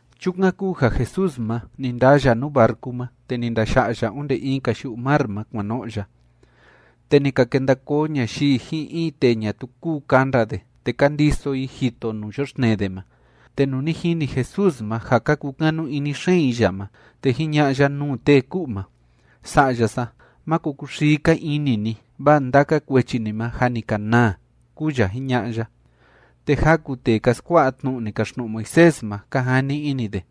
Chukan kúu ja Jesús ma, ni ndaa ya nuu barcu ma, te ni ndaya'a ya onde in‑ka yu'u mar ma, kuan no'o ya. Te ni ka kenda koo ñayii ji'in in tee ñatuu kúu kanda de, te ka ndiso i jito nuu yoxtnee de ma. Te nuu ni jini Jesús ma ja ka kukanu ini xeen i ya ma, te jiña'a ya nuu tee ku'u ma: ―Sa'ya sa, máko kuxii‑ka ini ni, vaa ndaka kuechi ni ma jâ ni ka naa ―kúu ya jiña'a ya. Te jaku tee ka skua'a tnu'u ni kaxtnu'u Moisés ma, ka jani ini de: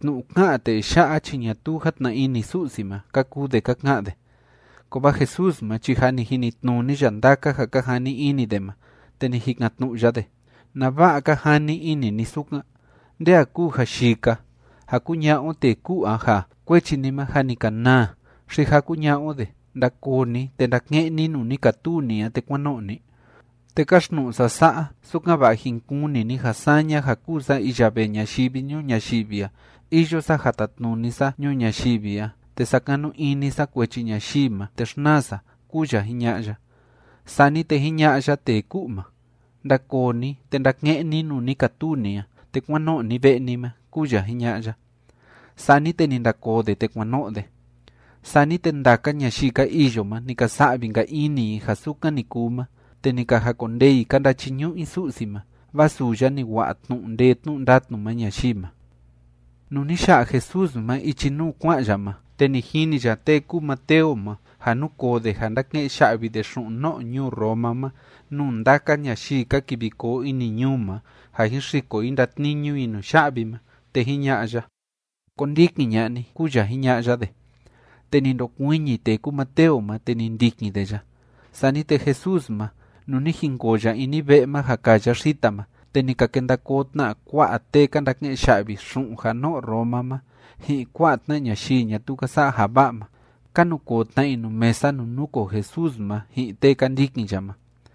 “Tnu'u ká'an tee ya'a chi ñatuu játna ini Su'si ma”, ka kuu de ka ka'an de. Kovaa Jesús ma chi jâ ni jinitnuni ya ndaka ja ka jani ini de ma, te ni jikan‑tnu'u ya de: ―¿Nava'a ka jani ini ni sukan? ¿Nde a kúu ja yii‑ka? ¿Ja kuña'a o tee ku'u a ja: “Kuechi ni ma jâ ni ka naa”? ¿Xi ja kuña'a o de: “Ndakoo ni, te ndake'en ni nuu ni katuu ni a, te kuán no'o ni”? Te káxtnu'u sa sa'a, sukan‑va'a jin kuni ni ja saña ja kúu sa iya vee ñayivi ñuu ñayivi a, iyo sa ja tatnuni sa ñuu ñayivi a, te sakanu ini sa kuechi ñayii ma, te xnaa sa ―kúu ya jiña'a ya. Sani te jiña'a ya tee ku'u ma: ―Ndakoo ni, te ndake'en ni nuu ni katuu ni a, te kuán no'o ni ve'e ni ma ―kúu ya jiña'a ya. Sani te ni ndakoo de, te kuan no'o de. Sani te ndaka ñayii ka iyo ma, ni ka sa'vi‑nka ini i ja sukan ni kuu ma, te ni ka jakondee i ka ndachiñu'u i Su'si ma, vaa suu ya ni wa'a tnu'u ndee tnu'u ndatnu ma ñayii ma. Nuu ni ya'a Jesús ma ichi nuu kua'an ya ma, te ni jini ya tee kúu Mateo ma, ja núkoo de ja ndáke'en ya'vi de xu'un no'o ñuu Roma ma nuu ndaka ñayii ka kivi koo ini ñuu ma ja jin xiko i ndatniñu i nuya'vi ma. Te jiña'a ya: ―Kondikin ña'a ni ―kúu ya jiña'a ya de. Te ni ndokuiñi tee kúu Mateo ma, te ni ndikin de ya. Sani te Jesús ma, nuu ni jinkoo ya ini ve'e ma ja kaa ya xita ma, te ni ka kenda koo tna kua'a tee ka ndake'en ya'vi xu'un ja no'o Roma ma ji'in kua'a tna ñayii ñatuu ka sa'a ja va'a ma. Ka nukoo tna i nuu mesa nuu núkoo Jesús ma ji'in tee ka ndikin ya ma.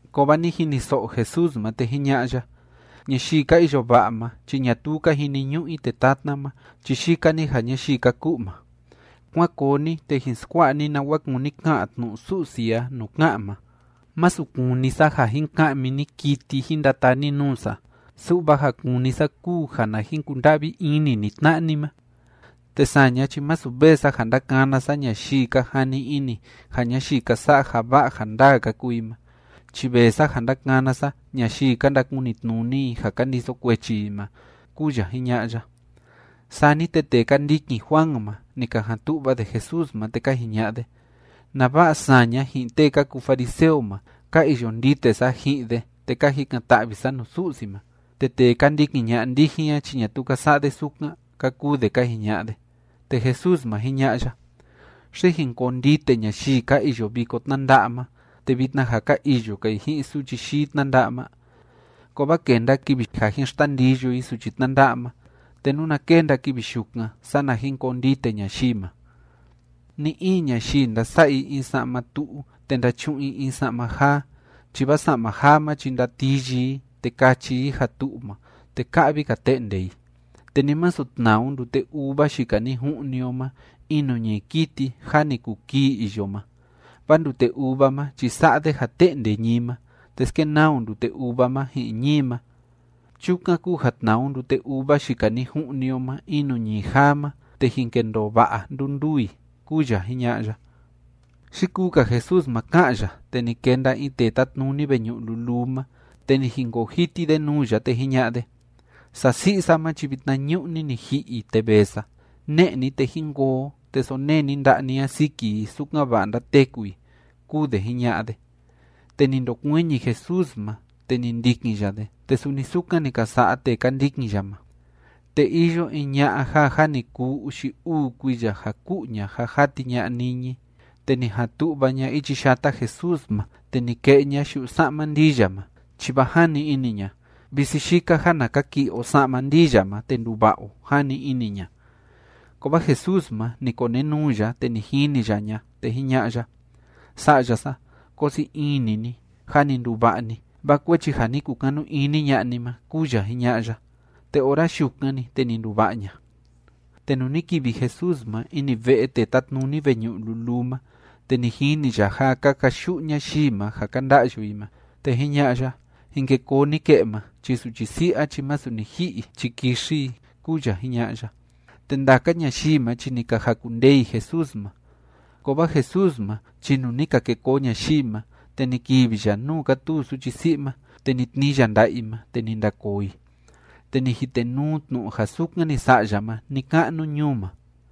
Kovaa ni jiniso'o Jesús ma, te jiña'a ya: ―Ñayii ka iyo va'a ma chi ñatuu ka jiniñu'u i tee tatna ma, chi yika‑ni ja ñayii ka ku'u ma. Kuán koo ni, te jin skua'a ni nawa kúni ka'an tnu'u Su'si a nuu ká'an ma: “Masu kúni sa ja jin ka'mi ni kiti jin ndataa ni nuu sa, su'va ja kúni sa kúu ja na jin kunda'vi ini ni tna'a ni ma.” Te saña chi masu vee sa ja ndakana sa ñayii ka jani ini ja ñayii ka sa'a ja va'a ja ndaa ka kuu i ma, chi vee sa ja ndakana sa ñayii ka ndakunitnuni i ja ka ndiso kuechi i ma ―kúu ya jiña'a ya. Sani te tee ka ndikin Juan ma, ni ka jan tu'va de Jesús ma, te ka jiña'a de: ―¿Nava'a saña ji'in tee ka kuu fariseo ma, ka iyo ndite sa ji'in de te ka jikan‑ta'vi sa nuu Su'si ma, te tee ka ndikin ña'a ndijin a chi ñatuu ka sa'a de sukan? ―ka kuu de ka jiña'a de. Te Jesús ma, jiña'a ya: ―¿Xi jin koo ndite ñayii ka iyo viko tnánda'a ma, te vitna ja ka iyo‑ka i ji'in suchi yii tnánda'a ma? Kovaa kenda kivi ja jin xtandiyo i suchi tnánda'a ma. Te nuna kenda kivi yukan, sana jin koo ndite ñayii ma. ’Ni‑in ñayii ndasa'a i in sa'ma tu'u te ndachu'un i in sa'ma jaa, chi vaa sa'ma jaa ma chi ndatiyi i, te kachi i ja tu'u ma, te ka'vi‑ka te'nde i. Te ni masu tnaa o ndute uva yika ni ju'ni o ma in nuu ñií kiti jâ ni kuu kii iyo ma, vaa ndute uva ma chi sa'a de ja te'nde ñií ma, te skenaa o ndute uva ma ji'in ñií ma. Chukan kúu ja tnaa o ndute uva yika ni ju'ni o ma in nuu ñií jaa ma, te jin kendoo va'a nduu nduu i ―kúu ya jiña'a ya. Yikuu‑ka Jesús ma ká'an ya, te ni kenda in tee tátnuni veñu'u luluu ma, te ni jinkoo jiti de nuu ya, te jiña'a de: ―Sasi'i sa ma chi vitnañu'ni ni ji'i i, te vee sa. Ne'e ni, te jín koo o, te sonee ni nda'a ni a siki i, sukan‑va'a ndateku i ―kúu de jiña'a de. Te ni ndokuiñi Jesús ma, te ni ndikin ya de, te suni sukan ni ka sa'a tee ka ndikin ya ma. Te iyo in ña'a ja jâ ni kuu uxi uu kuiya ja ku'u ña ja jati ña'a niñi. Te ni jan tu'va ña ichi yata Jesús ma, te ni ke'e ña yu'u sa'ma ndii ya ma, chi vaa jani ini ña: “Visi yika ja na kaki'i o sa'ma ndii ya ma, te nduva'a o”, jani ini ña. Kovaa Jesús ma, ni konenuu ya, te ni jini ya ña, te jiña'a ya: ―Sa'ya sa, koo sii ini ni. Jâ ni nduva'a ni, vaa kuechi ja ni kukanu ini ña'a ni ma ―kúu ya jiña'a ya. Te ora yukan‑ni, te ni nduva'a ña. Te nuu ni kivi Jesús ma ini ve'e tee tátnuni veñu'u luluu ma, te ni jini ya ja ka kayu'u ñayii ma ja ka nda'yu i ma. Te jiña'a ya: ―Jin ke koo ni ke'e ma. Chi suchi si'i a chi masu ni ji'i i chi kixi i ―kúu ya jiña'a ya. Te ndaka ñayii ma chi ni ka jakundee i Jesús ma. Kovaa Jesús ma chi nuu ni ka ke koo ñayii ma, te ni kivi ya nuu kátuu suchi si'i ma, te ni tnii ya nda'a i ma, te ni ndakoo i. Te ni jitenuu tnu'u ja sukan ni sa'a ya ma ni‑ka'nu ñuu ma.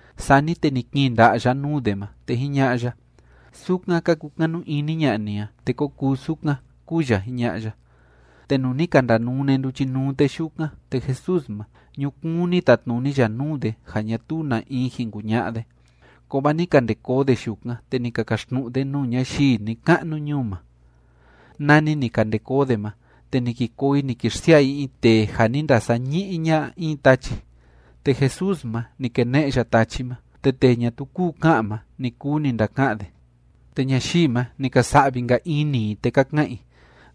Sani te ni kiin nda'a ya nuu de ma, te jiña'a ya: ―Sukan ka kukanu ini ña'a ni a, te ko kuu sukan ―kúu ya jiña'a ya. Te nuu ni ka ndanune nduchinuu tee yukan, te Jesús ma, ñukuun ni tatnuni ya nuu de ja ñatuu na in jin kuña'a de. Kovaa ni ka nde koo de yukan, te ni ka kaxtnu'u de nuu ñayii ni‑ka'nu ñuu ma. Nani ni ka nde koo de ma, te ni ki koo i ni ki xsia'a i in tee ja ni ndasañi'i ña'a in tachi. Te Jesús ma, ni kene'e ya tachi ma, te tee ñatuu kúu ka'an ma, ni kuu ni ndaka'an de. Te ñayii ma, ni ka sa'vi‑nka ini i, te ka ka'an i: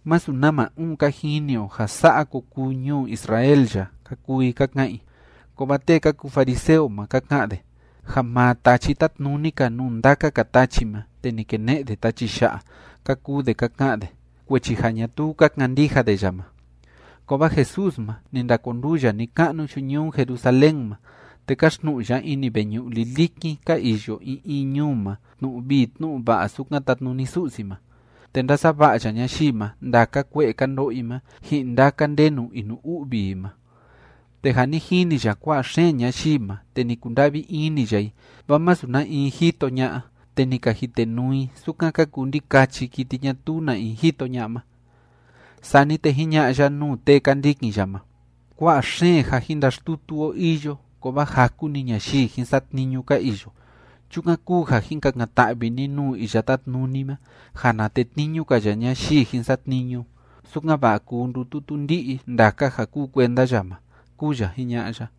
―Masu nama uun ka jini o ja sa'a ko kuu ñuu Israel ya ―ka kuu i ka ka'an i. Kovaa tee ka kuu fariseo ma, ka ka'an de: ―Ja maa tachi tátnuni‑ka nuu ndaka‑ka tachi ma te ni kene'e de tachi ya'a ―ka kuu de ka ka'an de, kuechi ja ñatuu ka kandija de ya ma. Kovaa Jesús ma, ni ndakonduu ya ni‑ka'nu yu'u ñuu Jerusalén ma, te káxtnu'u ya ini veñu'u lilikin ka iyo in in ñuu ma tnu'u vii tnu'u va'a sukan tatnuni Su'si ma, te ndásava'a ya ñayii ma ndaka kue'e ka ndo'o i ma ji'in ndaka ndenu inu‑u'vi i ma. Te ja ni jini ya kua'a xeen ñayii ma, te ni kunda'vi ini ya i, vaa masu na in jito ña'a, te ni ka jitenuu i sukan ka kuu ndikachi kiti ñatuu na in jito ña'a ma. Sani te jiña'a ya nuu tee ka ndikin ya ma: ―Kua'a xeen ja jin ndaxtutu o iyo, kovaa jaku‑ni ñayii jin satniñu ka iyo. Chukan kúu ja jin kakan‑ta'vi ni nuu Iya Tátnuni ma ja na tetniñu‑ka ya ñayii jin satniñu, sukan‑va'a kuu ndututu ndi'i ndaka ja kúu kuenda ya ma ―kúu ya jiña'a ya.